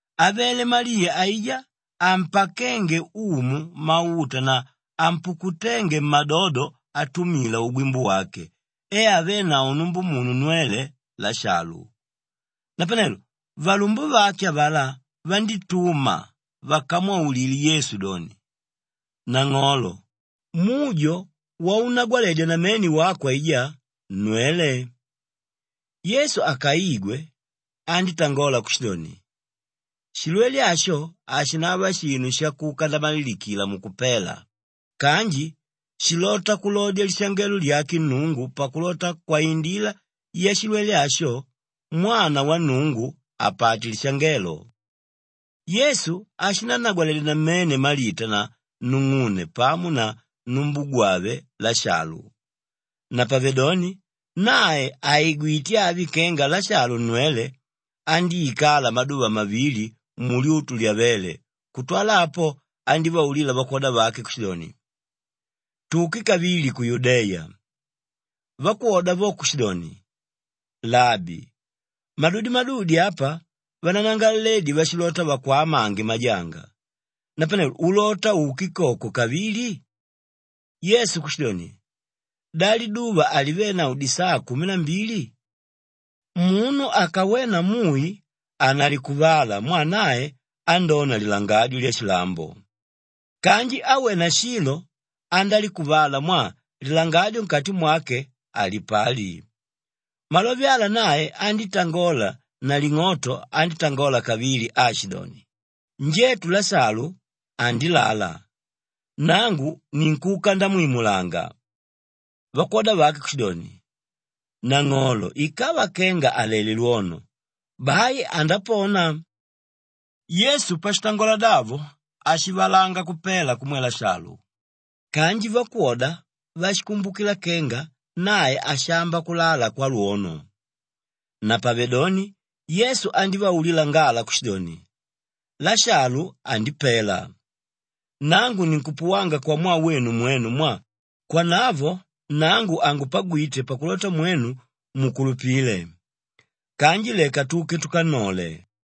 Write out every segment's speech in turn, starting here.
Avele Maliya aijá ampakénge Umu mauta na ampukuténge mmadodo atumila ugwimbu wake e avénavo numbumunu nnwele, Lashalu. Napanelo valumbumunu avalá vandítuma vakamwaulile Yesu doni, “Nang'olo, mujo waunnagwaledya namene wako aijá, nnwele.” Yesu akaigwe, andítangola kushidoni, “Shilwele asho hashinava shinu shakuka ndamalilikila mukupela kanji shilota kulodya lishangelo lyake Nnungu pakulota kwaindila yashilwele asho, Mwana wa Nnungu apate lishangelo.” Yesu ashinannagwaledya namene Malita na nung'une pamo na numbugwave Lashalu. Napavedoni nae àigwite avi kenga Lashalu nnwele, andíikala maduva mavili mulyutu lyavéle kutwala apo andívaulila vakwoda vake kushidoni, “Tuke kavili ku Yudeya.” Vakwoda vo kushidoni, “Labi, madudi-madudi apa vananangalaledi vashilota vakwamange majanga; napanelo ulota uke koko kavili?” Yesu kushidoni, “Da liduva halivenavo disaa kumi na mbili? Munu akawena mui hanalikuvala mwaa nae andóna lilangadyo lyashilambo. Kanji áwena shilo andálikuvala mwaa lilangadyo nkati mwake halipali.” Malove ala nae andítangola naling'oto andítangola kavili aashidoni, “Njetu Lashalu andilala, nangu ninkuka ndamwimulanga.” Vakwoda vake kushidoni, “Nang'olo ikava kenga alelé lwono, bai andapona.” Yesu pashitangola davo ashivalanga kupela kumwe Lashalu kanji vakwoda vashikumbukila kenga nae ashamba kulala kwalwono. Napavedoni Yesu andívaulila ngala kushidoni, “Lashalu andipela. Nangu ninkupuwanga kwamwaa wenu mwenu mwaa kwanavo nangu hangupagwite pakulota mwenu mukulupile. Kanji leka tuke tukannole.”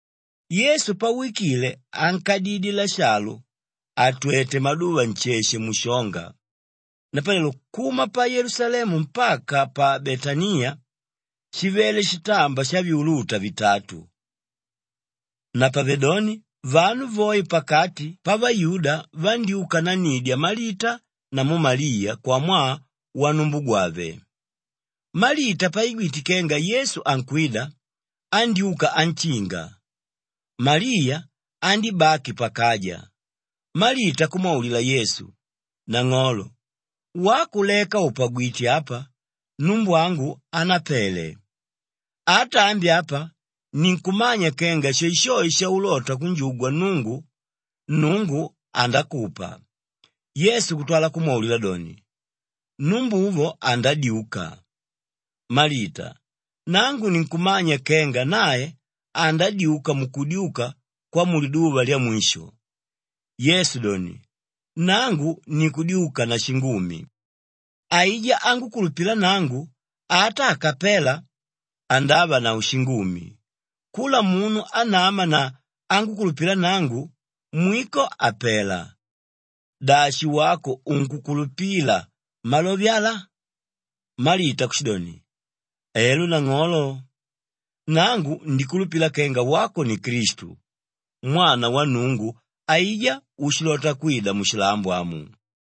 Yesu pawikile ànkadidye Lashalu àtwete maduva nsheshe mushonga. Napanelo kuma pa Yelusalemu mpaka pa Betaniya shivele shitamba shavyuluta vitatu. Napavedoni vanu voe pakati pavayuda vandyúka nannidya Malita namu Maliya kwamwaa wanumbugwave. Malita paigwite kenga Yesu ankwida, andyúka anshinga. Maliya andíbaki pakaja. Malita kumwaulila Yesu, “Nang'olo, wako leka ùpagwite apa numbwangu hanapele. Ata ambi apa ninkumanya kenga shoeshoe shaulota kunjugwa Nnungu, Nnungu andakupa.” Yesu kutwala kumwaulila doni, “Numbuvo andadyuka.” Malita, “Nangu ninkumanya kenga nae andadyuka mukudyuka kwamuliduva lyamwisho.” Yesu doni, “Nangu ni Kudyuka na Shingumi. Aijá ángukulupila nangu, ata akapela andavanavo shingumi. Kula munu ánama na ángukulupila nangu, mwiko hapela. Dashi wako unkukulupila malove ala?” Malita kushidoni, “Elo nang'olo. Nangu ndikulupila kenga wako ni Klistu, Mwana wa Nnungu aijá úshilota kwida mushilambo amu.”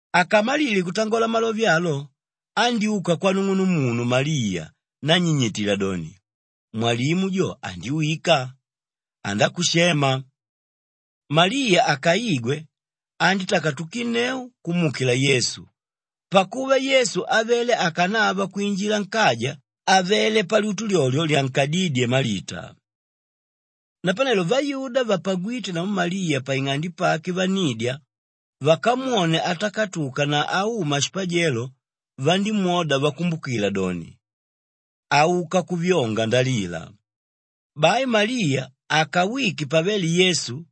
Akamalile kutangola malove alo andyúka kwanung'unumunu Maliya nannyinyitila doni, “Mwalimu jo andiwika, andákushema.” Maliya akaigwe, andítakatukinneu kumuukila Yesu pakuva Yesu avele akanava kwinjila nkaja àvele palyutu lyolyo lyankodídye Malita. Napanelo vayuda vapagwíte namu Maliya paing'ande pake vannidya, vakamwone atakatuka na auma shipajelo vandímwoda vakumbukila doni, auka kuvyonga ndalila. Bai Maliya akawike pavele Yesu,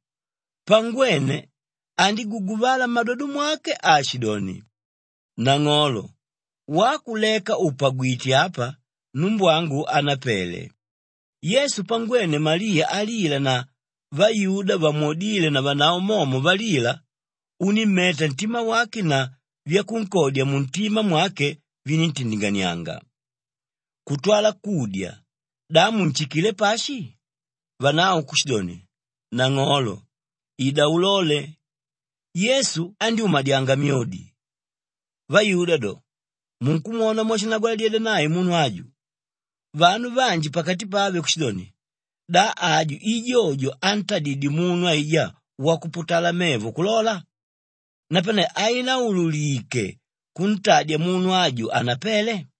pangwene andíguguvala mmadodo mwake aashidoni, “Nang'olo, wako leka ùpagwite apa numbwangu hanapele.” Yesu pangwene Maliya alila na vayuda vamwodíle navanavo momo valila, unímmeta ntima wake na vyakunkodya muntima mwake viníntindinganianga. Kutwala kudya, “Da munshikilé pashi?” Vanavo kushidoni, “Nang'olo, ida ulole.” Yesu andyúmadyanga myodi. Vayuda do, “Munkwona mwashinnagwaladyedya nae munu aju!” Vanu vanji pakati pave kushidoni, “Da aju i jojo ántadidye munu aijá wakuputala mevo kulola? Napane hainaululike kuntadya munu aju hanapele?”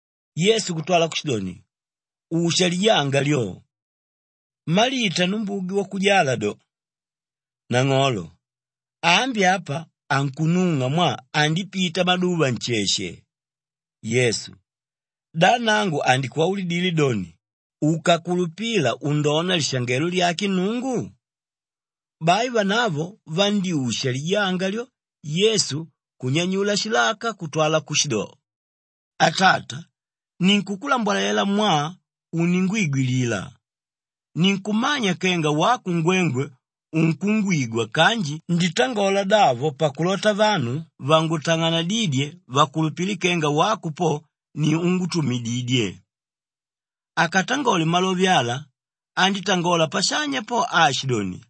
Yesu kutwala kushidoni, “Usha lijanga lyo!” Malita numbugwe wakujala do, “Nang'olo, ambi apa ankunung'a mwaa andipita maduva nsheshe.” Yesu, “Da nangu handikwaulidile doni, ukakulupila undona lishangelo lyake Nnungu?” Bai vanavo vandyúsha lijanga lyo Yesu kunyanyula shilaka kutwala kushido, “Atata, ninkukulambwalela mwaa uningwigwilila. Ninkumanya kenga wako ngwengwe unkungwigwa kanji nditangola davo pakulota vanu vangutang'anadídye vakulupile kenga wako po, ni úngutumididye.” Akatangole malove ala andítangola pashanya po aashidoni,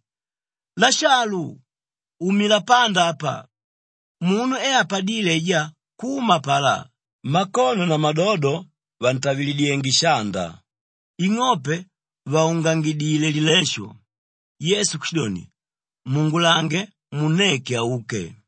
“Lashalu, umila panda apa!” Munu e apadíle aijá kuma apalá, makono na madodo vàntavilidyenge shanda, ing'ope vàungangidile lilesho. Yesu kushidoni, “Muungulange munneke auke.”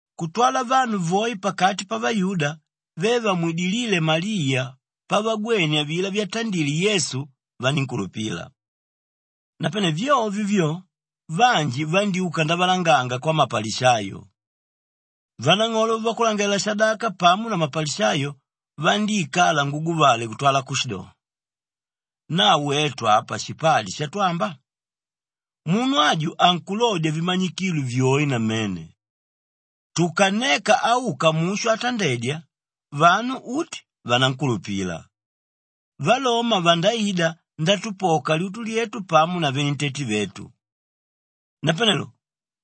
Kutwala vanu voe pakati pavayuda ve vamwidilíle Maliya pavagwene avilá vyatandile Yesu vanínkulupila. Napane vyovyo vyo, vanji vandyúka ndavalanganga kwamapalishayo. Vanang'olo vavakulangalalela-shadaka pamo na mapalishayo vandíikala nguguvale kutwala kushido, “Na wetu apa shipali shatwamba? Munu aju ankulodya vimanyikilo vyoe namene. Tukanneka auka mushu atandedya, vanu uti vanankulupila. Valoma vandaida ndatupoka lyutu lyetu pamo na venentete vetu.” Napanelo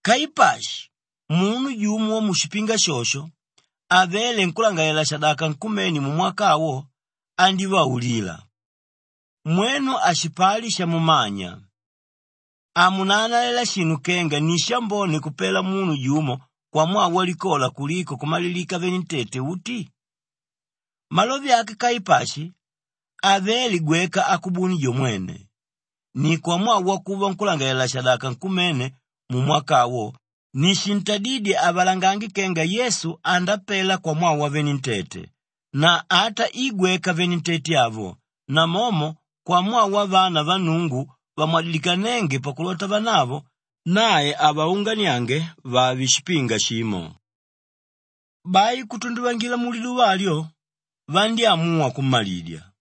Kaipashi, munu jumo wamushipinga shosho, avéle nkúlangalalela-shadaka nkumene mumwaka awo, andívaulila, “Mwenu hashipali shamumanya! Hamunaanalela shinu kenga ni shambone kupela munu jumo kwamwaa walikola kuliko kumalilika venentete uti?” Malove ake Kaipashi havele gweka akubuni jo mwene. Ni kwamwaa wakuva nkúlangalalela-shadaka nkumene mumwaka awo ni shintadídye avalangange kenga Yesu andapela kwamwaa wavenentete na ata i gweka venentete avo, namomo kwamwaa wavana va Nnungu vamwadilikanénge pakulota vanavo, nae avaunganiange vave shipinga shimo. Bai kutunduvangila muliduva alyo, vandyámuwa kummalidya.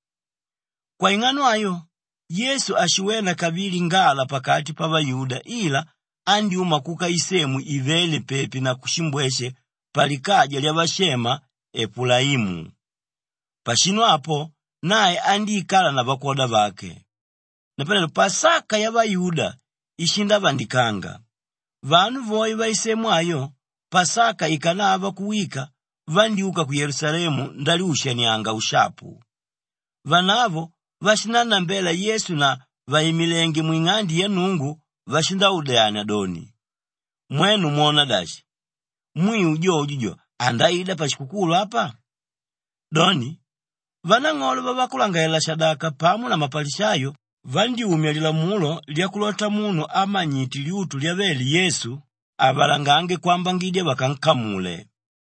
Kwaing'ano ayo, Yesu hashiwena kavili ngala pakati pavayuda ila andyúma kuka isemu ívele pepi na kushimbweshe palikaja lyavashema Epulaimu. Pashinu apo, nae andíikala na vakwoda vake. Napanelo Pasaka yavayuda ishindavandikanga. Vanu voe vaisemu ayo, Pasaka ikanava kuwika vandyúka ku Yelusalemu ndalyushanianga ushapu. Vanavo vashinannambela Yesu na vàimilenge mwing'ande ya Nnungu vashindaudyania doni, “Mwenu mwona dashi? Mwiu, jojo jo andaida pashikukulu apa?” Doni, vanang'olo vavakulangalalela-shadaka pamo na mapalishayo vandyúmya lilamulo lyakulota munu ámanyite lyutu lyavele Yesu, avalangange kwambangidya vakankamule.